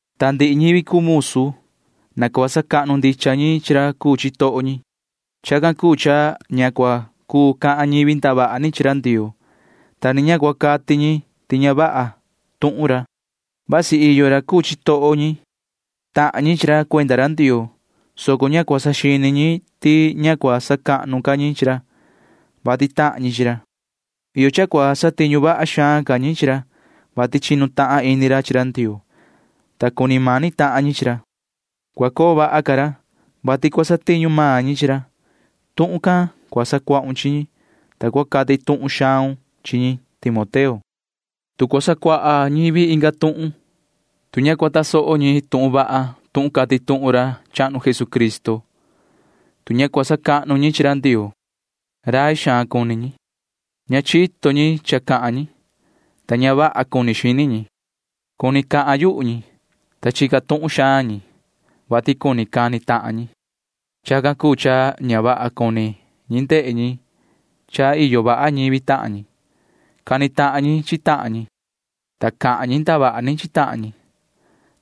Ta ndihi ñivi cuu musu―na cua sacahnu ndicha ñi chi ra cuu chitoho ñi. Chacan cuu cha ña cua cuu cahan ñivi ndavaha ni chi ra Ndioo, ta ni ña cua cati ñi ti ña vaha tuhun ra. Vasi iyo ra cuu chitoho ñi―tahan ñi chi ra cuenda ra Ndioo, soco ña cua saxini ñi ti ña cua sacahnu ca ñi chi ra, vati tahan ñi chi ra. Iyo cha cua satiñu vaha xaan ca ñi chi ra, vati chinu tahan ini ra chi ra Ndioo, ta cuni mani tahan ñi chi ra. Cua coo vaha ca ra, vati cua satiñu maan ñi chi ra. Tuhun can cua sacuahun chi ñi, ta cua cati tuhun xaun chi ñi, [yoho Timoteo]. Tu cua sacuaha ñivi inga tuhun, tu ña cua tasoho ñi tuhun vaha tuhun cati tuhun ra chahnu Jesucristo, tu ña cua sacahnu ñi chi ra Ndioo, rai xaan cuni ñi. Ña chito ñi cha cahan ñi, ta ña vaha cuni xini ñi. Cuni cahan yuhu ñi, ta chica tuhun xaan ñi, vati cuni cani tahan ñi. Chacan cuu cha ña vaha cuni ñi ndehe ñi cha iyo vaha ñivi tahan ñi. Cani tahan ñi chi tahan ñi, ta cahan ñi ndavaha ni chi tahan ñi,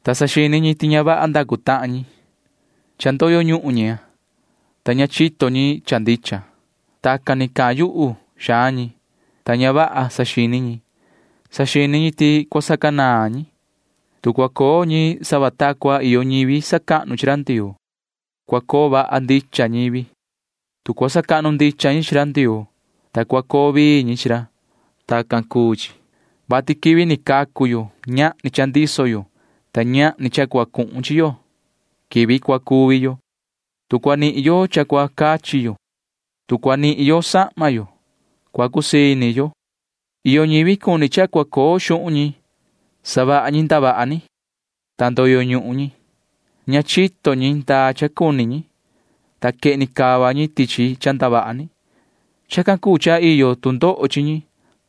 ta saxini ñi ti ña vaha ndacu tahan ñi. Cha ndoyo ñuhun ñi, ta ña chito ñi cha ndicha. Tacan ni cahan yuhu xaan ñi, ta ña vaha saxini ñi. Saxini ñi ti cua sacanaan ñi, tu cua coo ñi sava ta cua iyo ñivi sacahnu chi ra Ndioo. Cua coo vaha ndicha ñivi, tu cua sacahnu ndicha ñi chi ra Ndioo, ta cua coo vii ñi chi ra. Tacan cuu chi, vati quivi ni cacu yo―ñahni cha ndiso yo, ta ñahni cha cua cuhun chi yo quivi cua cuvi yo. Tu cua nihin yo cha cua cachi yo, tu cua nihin yo sahma yo, cua cusii ini yo. Iyo ñivi cuni cha cua coo xuhun ñi. Savaha ñi ndavaha ni, ta ndoyo ñuhun ñi. Ña chito ñi ndaa cha cuni ñi, ta quehni cava ñi tichi cha ndavaha ni. Chacan cuu cha iyo tu ndoho chi ñi,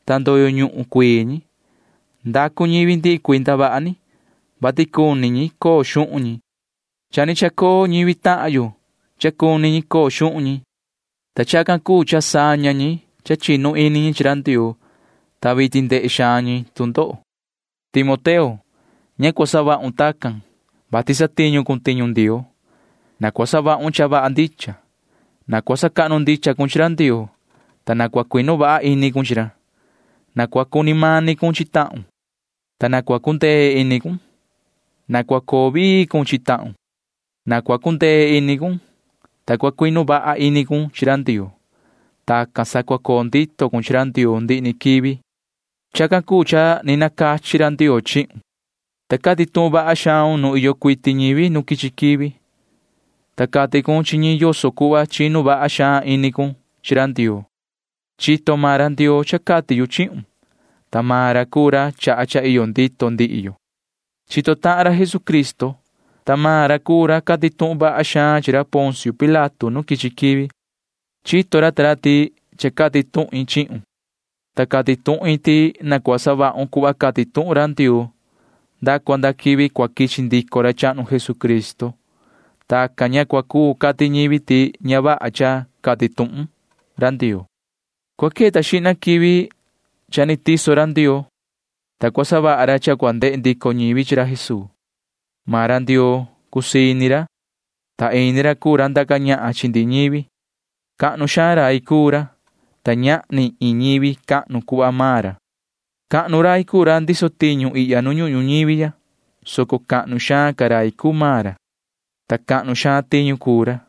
ta ndoyo ñuhun cuii ñi. Ndacu ñivi ndihi cuii ndavaha ni, vati cuni ñi coo xuhun ñi. Cha ni chacoo ñivi tahan yo cha cuni ñi coo xuhun ñi, ta chacan cuu cha saña ñi cha chinu ini ñi chi Ndioo, ta vitin ndehe xaan ñi tu ndoho. Yoho Timoteo, ña cua savahun tacan, vati satiñu cun tiñu Ndioo. Na cua savahun cha vaha ndicha. Na cua sacahnu ndicha cun chi ra Ndioo, ta na cua cuinu vaha ini cun chi ra. Na cua cuni mani cun chi tahun, ta na cua cundee ini cun, ta na cua coo vii cun chi tahun. Na cua cundee ini cun, ta cua cuinu vaha ini cun chi ra Ndioo. Tacan sa cua coo ndito cun chi ra Ndioo ndihi ni quivi. Chacan cuu cha ni nacachi ra Ndioo chihun, ta cati tuhun vaha xaun nuun iyo cuiti ñivi nu quichi quivi, ta cati cun chi ñi yoso cuhva chinu vaha xaan ini cun chi ra Ndioo. Chito maan ra Ndioo cha cati yu chihun, ta maan ra cuu ra chaha cha iyo ndito ndihi yo. Chito tahan ra Jesucristo, ta maan ra cuu ra cati tuhun vaha xaan chi ra Poncio Pilato nu ni quichi quivi. Chito ra ta ra ti cha cati tuhin chihun, ta cati tuhin ti na cua savahun cuhva cati tuhun ra Ndioo nda cua nda quivi cua quichi ndico ra chahnu Jesucristo. Tacan ña cua cuu cati ñivi ti ña vaha cha cati tuhun ra Ndioo. Cua queta xihna quivi cha ni tiso ra Ndioo, ta cua savaha ra cha cua ndehe ndico ñivi chi ra Jesuu. Maan ra Ndioo cusii ini ra, ta ini ra cuu ra ndaca ñahan chi ndihi ñivi. Cahnu xaan rai cuu ra, ta ñahni iin ñivi cahnu cuhva maan ra. Cahnu rai cuu ra ndiso tiñu ihya nu ñuhun ñuñivi ya, soco cahnu xaan ca rai cuu maan ra, ta cahnu xaan tiñu cuu ra.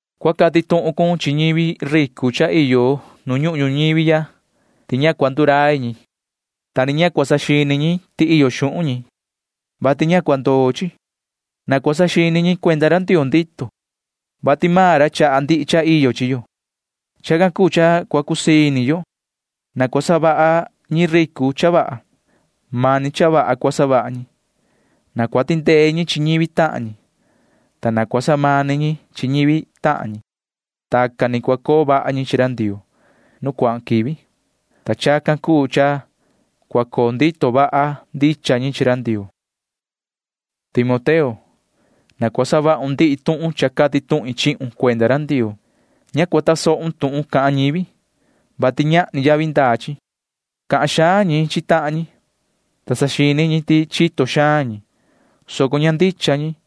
Cua cati tuhun cun chi ñivi ricu cha iyo nu ñuhun ñuñivi ya ti ña cua ndurai ñi, ta ni ña cua saxini ñi ti iyo xuhun ñi, vati ña cua ndoo chi. Na cua saxini ñi cuenda ra Ndioo ndito, vati maan ra chaha ndihi cha iyo chi yo. Chacan cuu cha cua cusii ini yo. Na cua savaha ñi ricu cha vaha. Mani cha vaha cua savaha ñi. Na cua tindee ñi chi ñivi tahan ñi, ta na cua samani ñi chi ñivi tahan ñi. Tacan ni cua coo vaha ñi chi ra Ndioo nu cuahan quivi, ta chacan cuu cha cua coo ndito vaha ndicha ñi chi ra Ndioo. Yoho Timoteo, na cua savahun ndihi tuhun cha cati tuhin chihun cuenda ra Ndioo. Ña cua tasohun tuhun cahan ñivi, vati ñahni yavi ndaa chi. Cahan xaan ñi chi tahan ñi, ta saxini ñi ti chito xaan ñi, soco ña ndicha ñi.